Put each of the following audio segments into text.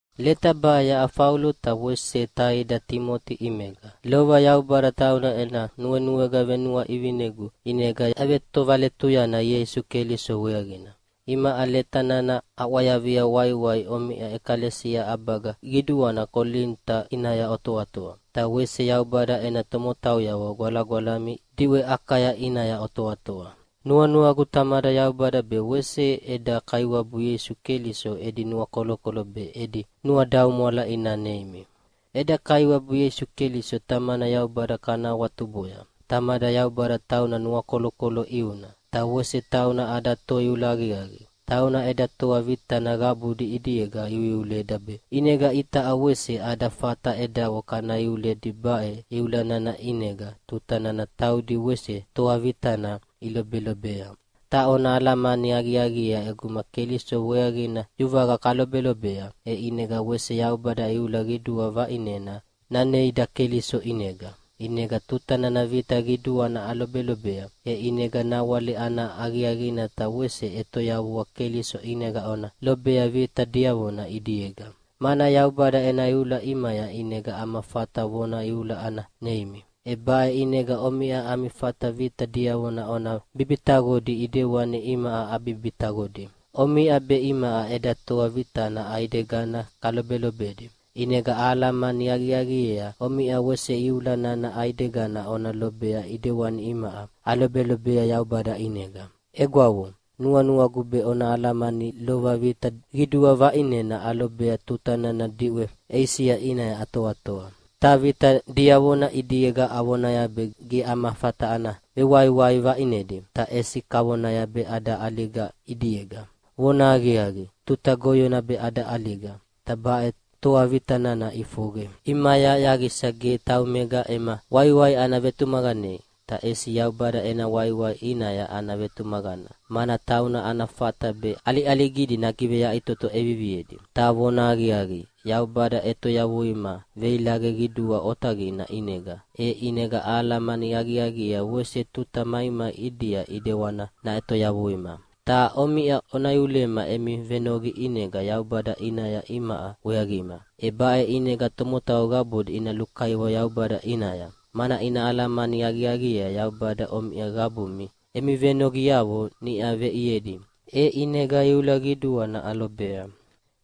Leta baʼe yaʼa Faulo ta wese taida Timoti ʼimega. Lova Yaubada tauna ena nuenuega venuaʼivinegu ʼinega yavetovaletuyana Ieisu Keliso weaqina. Imaʼa leta nana aʼwayavia waiwai omiʼa ʼekalesia ʼabaga qiduana Kolinita ʼinaya otoatoa, ta wese Yaubada ena tomotauyavo gwalagwalami diʼwe Akaya ʼinaya otoatoa. Nuanuagu Tamada Yaubada be wese eda Kaiwabu Ieisu Keliso edi nuakolokolo be edi nuadaumwala ina neimi. Eda Kaiwabu Ieisu Keliso Tamana Yaubada kana awatuboya. Tamada Yaubada tauna nuakolokolo ʼiuna, ta wese tauna ada Toiula aqiaqi. Tauna eda toa vitana qabudi ʼidiega iuiuleda be ʼinega itaʼa wese ada fata edavo kana iuledi baʼe iula nana ʼinega tuta nana taudi wese toa vitana ilobelobea. Ta ona alamani aqiaqiea ʼeguma Keliso weaqina yuvaqa kalobelobea, e ʼinega wese Yaubada iula qidua vaʼinena naneida Keliso ʼinega. ʼInega tuta nana vita qiduana alobelobea, e ʼinega nawale ana aqiaqina ta wese ʼetoyavua Keliso ʼinega ona lobea vita diavona ʼidiega. Mana Yaubada ena iula ʼimaya ʼinega ama fata vona iula ana neimi. E baʼe ʼinega omiʼa ami fata vita diavona ona bibitaqodi ʼidewani imaʼa abibitaqodi. Omiʼa be imaʼa eda toa vitana ʼaidegana kalobelobedi, ʼinega ahalamani aqiaqiea omiʼa wese iula nana ʼaidegana ona lobea ʼidewani imaʼa alobelobea Yaubada ʼinega. Egwavo, nuanuagu be ona alamania lova vita qidua vaʼinena alobea tuta nana diʼwe Eisia ʼinaya atoatoa. Ta vita diavona ʼidiega avonaya be ge ama fata ana vewaiwai vaiʼnedi, ta ʼesi kavonaya be ada ʼaliga ʼidiega. Vonahaqiaqi, tuta goyona be ada ʼaliga, ta baʼe toa vita nana ʼifoqe ʼimaya yaqisa ge taumega ema waiwai ana vetumaqanei, ta ʼesi Yaubada ena waiwai ʼinaya ana vetumaqana, mana tauna ana fata be ʼaliʼaligidi nagiveyaʼitoto ʼeviviedi. Ta vonahaqiaqi, Yaubada ʼetoyavuima veilaqe qidua otaqina ʼinega. E ʼinega ahalamani aqiaqiea wese tuta maimai ʼidia ʼidewani naʼetoyavuima. Ta omiʼa ona iulema emi venoqi ʼinega Yaubada ʼinaya imaʼa weaqima. E baʼe ʼinega tomotau qabudi ina lukaiwa Yaubada ʼinaya, mana ina alamani aqiaqiea Yaubada omiʼa qabumi emi venoqiavo niʼa veʼiedi, e ʼinega iula qiduana alobea.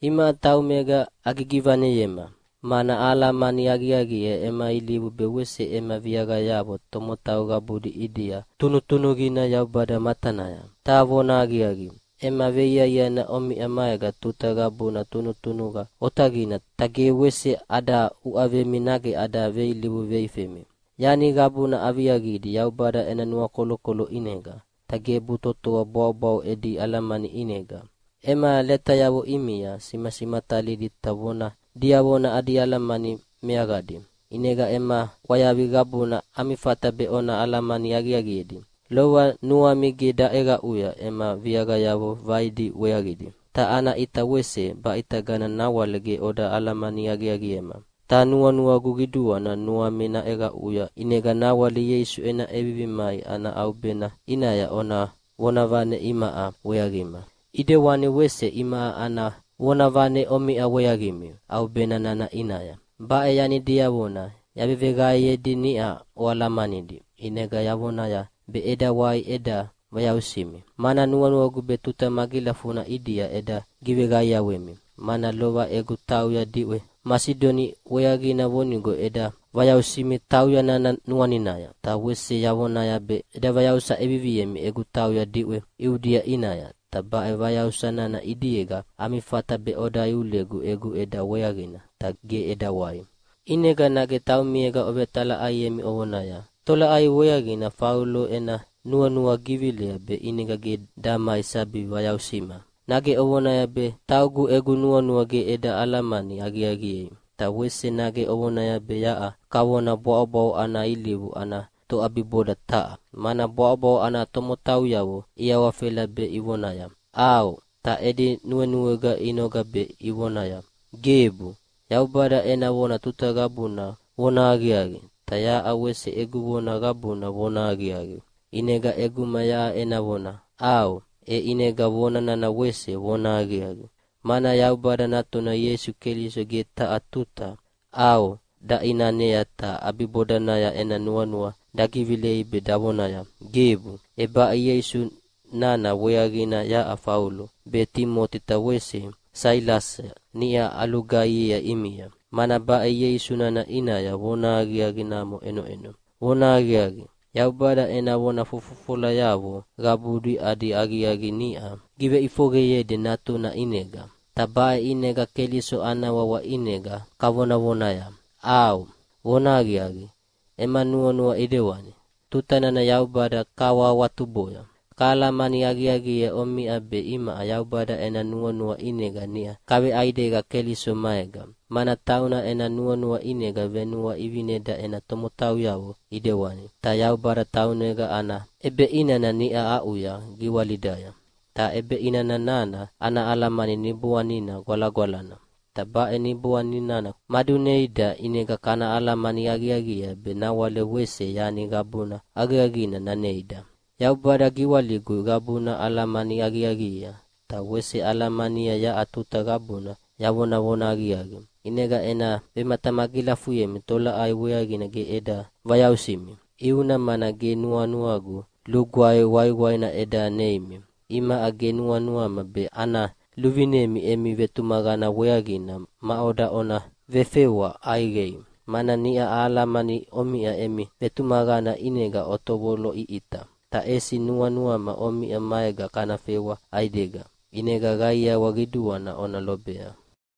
Imaʼa taumega agigivaneyema, mana ahalamani aqiaqiea ema ilivu be wese ema viaqayavo tomotau qabudi ʼidia tunutunuqina Yaubada matanaya. Ta vonahaqiaqi, ema veiaiana omiʼa maega tuta qabuna tunutunuqa otaqina ta ge wese ada uʼavemi nage ada veilivu veifemi. Yani qabuna aviaqidi Yaubada ena nuakolokolo ʼinega, ta gebu totoa bwaʼobwaʼo edi alamani ʼinega. Ema letayavo ʼimia simasimatalidi ta vona diavona adi alamani meaqadi, ʼinega ema ʼwayavi qabuna ami fata be ona alamani aqiaqiedi. Lova nuami ge daʼeqaʼuya ema viaqayavo vaidi weaqidi, ta ana ʼita wese baʼitagana nawale ge oda alamani aqiaqiema. Ta nuanuagu qiduana nuami naʼeqaʼuya ʼinega nawale Ieisu ena ʼevivi mai ana ʼaubena ʼinaya ona vonavane imaʼa weaqima, ʼidewani wese imaʼa ana vonavane omiʼa weaqimi ʼaubena nana ʼinaya. Baʼe yani diavona yaveveqaeyedi niʼa oalamanidi, ʼinega yavonaya be eda wai eda vayausimi, mana nuanuagu be tuta magilafuna ʼidia eda giveqaiawemi. Mana lova egu tauya diʼwe Masidonia weaqina vonigo eda vayausimi tauya nana nuaninaya, ta wese yavonaya be eda vayausa ʼeviviemi egu tauya diʼwe Iudia ʼinaya. Ta baʼe vayausa nana ʼidiega ami fata be oda iulegu egu ʼeda weaqina. Ta ge eda wai. ʼInega nage taumiega ovetalaʼaiemi ovonaya, “Tolaʼai weaqina Faulo ena nuanua givilea be ʼinega ge damai sabi vayausima?” Nage ovonaya be taugu egu nuanua ge eda alamani aqiaqiei? Ta wese nage ovonaya be yaʼa kavona bwaʼobwaʼo ana ilivu ana toʼabiboda taha, mana bwaʼobwaʼo ana tomotauyavo iawafela be ivonaya, “ʼAo”, ta edi nuenuega inoga be ivonaya, “Gebu.” Yaubada ena vona tuta qabuna vonahaqiaqi, ta yaʼa wese egu vona qabuna vonahaqiaqi. ʼInega ʼeguma yaʼa ena vona “ʼAo”, e ʼinega vona nana wese vonahaqiaqi, mana Yaubada Natuna Ieisu Keliso ge taha tuta “ʼAo” daʼinanea ta ʼabibodanaya ena nuanua dagivilei be davonaya “Gebu.” E baʼe Ieisu nana weaqina yaʼa Faulo, be Timoti ta wese Sailasa niʼa alugaihiea ʼimia. Mana baʼe Ieisu nana ʼinaya vonahaqiaqi namo ʼenoʼeno. Vonahaqiaqi, Yaubada ena vona fofofolayavo qabudi adi aqiaqi niʼa giveʼifoqeyedi Natuna ʼinega. Ta baʼe ʼinega Keliso ana wawa ʼinega kavonavonaya, “ʼAo, vonahaqiaqi, ema nuanua ʼidewani!” tuta nana Yaubada kahawahawatuboya. Kahalamani aqiaqiea omiʼa be imaʼa Yaubada ena nuanua ʼinega niʼa kaveʼaidega Keliso maega, mana tauna ena nuanua ʼinega venuaʼivineda ena tomotauyavo ʼidewani. Ta Yaubada taunega ana ʼebeʼinana niʼa aʼuya giwalidaya, ta ʼebeʼinana nana ana alamani Niboanina Gwalagwalana. Ta baʼe Niboani nana maduneida, ʼinega kana alamani aqiaqiea be nawale wese yani qabuna aqiaqina naneida. Yaubada giwaligu qabuna alamani aqiaqiea, ta wese alahalamania yaʼa tuta qabuna yavonavona aqiaqi. ʼInega ena vematamagilafuyemi tolaʼai weaqina ge eda vayausimi. ʼIuna mana ge nuanuagu lugwae waiwaina eda neimi. Imaʼa ge nuanuama be ana luvinemi emi vetumaqana weaqina maʼoda ona vefewa ʼaiqei, mana niʼa ahalamania omiʼa emi vetumaqana ʼinega otovoloʼiʼita. Ta ʼesi nuanuama omiʼa maega kana fewa ʼaidega, ʼinega qaiawa qiduana ona lobea.